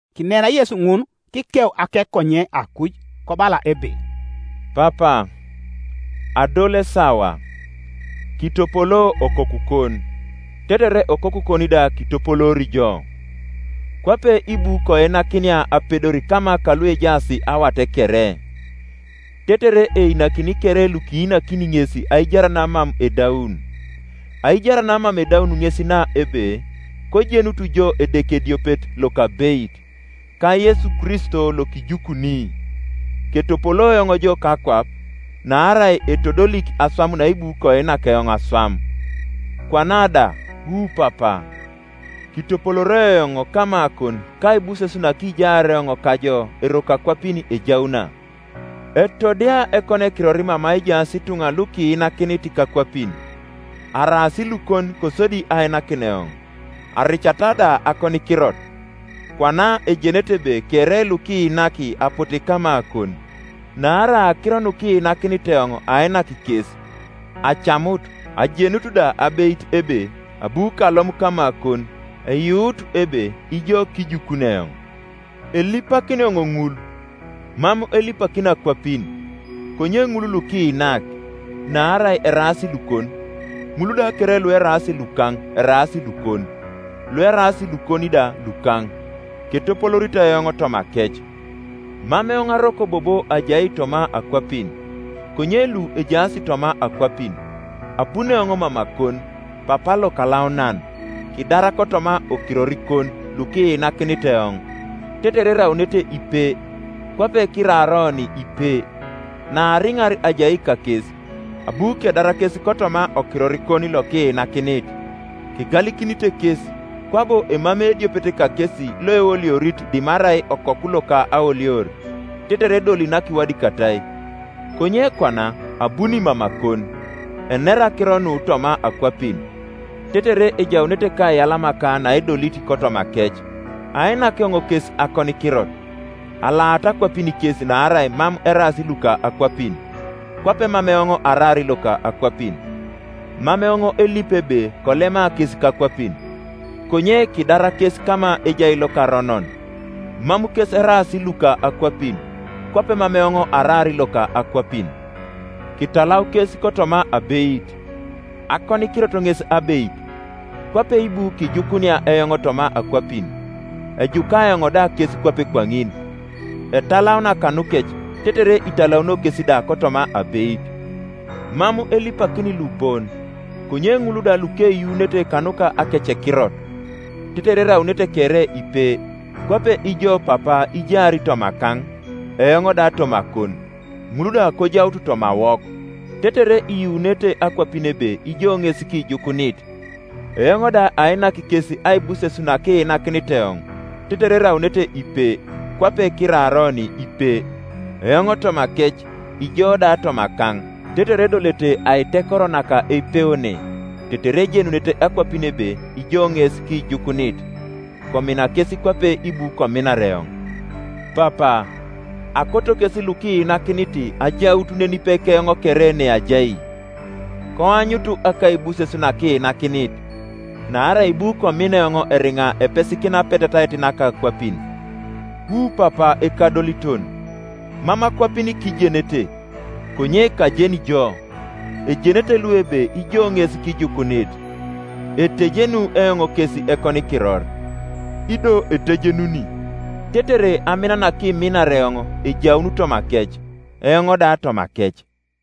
Kinera Yesu ŋun; kikeu akekonye akuj, kobala ebe, “Papa, adol esawa; kitopolo Okokukon, tetere Okokukon da kitopoloori jo. Kwape ibu koinakinia apedor kama kaluejaas awat kere, tetere einakini kere lukiinakini ŋes aijar namam edaun. Aijar namam edaun ŋes na ebe, kojenutu jo Edeke ediopet lokabeit, ka Yesu Kristo Iokijukuni. Ketopolo eoŋ jo kakwap, naarai etodolik aswam naibu koinak eoŋ aswam. Kwana da, wu Papa, kitopolooroi eoŋ kamakon kaibuses nakijaar eoŋ kajo eroko akwapin ejauna. “Etodia ekonikiror mama ejaas ituŋa lukiinakinit kakwapin; araas lukon kosodi ainakin eoŋ: aricata da akonikirot. Kwana ejenete ebe kere lukiinak apote kamakon: naarai akiro nukiinakinit eoŋ ainak kes; acamut, ajenut da abeit ebe abu kalom kamakon, eyuut ebe ijo kijukuni eoŋ. Elipakini eoŋ ŋul: mam elipakini akwapin, konye ŋul lukiinak; naarai eraas lukon. Ŋul da kere lueraas lukaŋ eraas lukon, lueraas lukon da lukaŋ; ketopolooritai eoŋ tomakec. Mam eoŋ aroko bobo ajai toma akwapin, konye lu ejaas toma akwapin, abuni eoŋ mamakon. Papa Lokalaunan, kidar kotoma okirorikon lukiinakinit eoŋ, tetere eraunete ipe, kwape kiraar oni ipe. Naariŋar ajai kakes, abu kedar kes kotoma okirorikon lokiinakinit; kegalikinite kes, kwabo emamei ediopet kakesi loeoliorit dimarai okoku loka aolior; tetere edoli nakiwadikatai. Konye kwana abuni mamakon; enera akiro nu toma akwapin, tetere ejaunete kaiyalamaka naedolit kotomakec. Ainak eoŋ kes akonikirot; alaata akwapin kes naarai mam eraas luka akwapin, kwape mam eoŋ araar loka akwapin. Mam eoŋ elipi ebe kolema kes kakwapin, konye kidar kes kama ejai lokaronon, Mam kes eraas luka akwapin, kwape mam eoŋ araar loka akwapin. Kitalau kes kotoma abeit; akonikirot ŋes abeit. Kwape ibu kijukunia eoŋ toma akwapin, ejuka eoŋ da kes kwape kwaŋin. Etalauna kanukec, tetere italaunio kes da kotoma abeit. “Mam elipakini lu bon, konye ŋul da lukeyuunete kanuka akecekirot; tetere eraunete kere ipe; kwape ijo Papa ijaar tomakaŋ, eoŋ da tomakon, ŋul da kojaut tomawok: tetere iyuunete akwapin ebe ijo ŋes kijukunit. Eoŋ da ainak kes aibuses nakiinakinit eoŋ; tetere eraunete ipe, kwape kiraar oni ipe: eoŋ tomakec, ijo da tomakaŋ, tetere edolete aitekoro naka eipeone; tetere ejenunete akwapin ebe ijo ŋes kijukunit, komina kes kwape ibu kominar eoŋ. Papa, akoto kes lukiinakinit ajaut nenipe keoŋ kere neajai; koanyutu akaibuses nakiinakinit; naarai ibu komina eoŋ eriŋa epesikina apetetait naka akwapin. Wu Papa Ekadoliton, mam akwapin kijenete, konye kajeni jo; ejenete lu ebe ijo ŋes kijukunit. Etejenu eoŋ kes ekonikiror, ido etejenuni, tetere amina nakiminar eoŋ ejaun tomakec, eoŋ da tomakec.”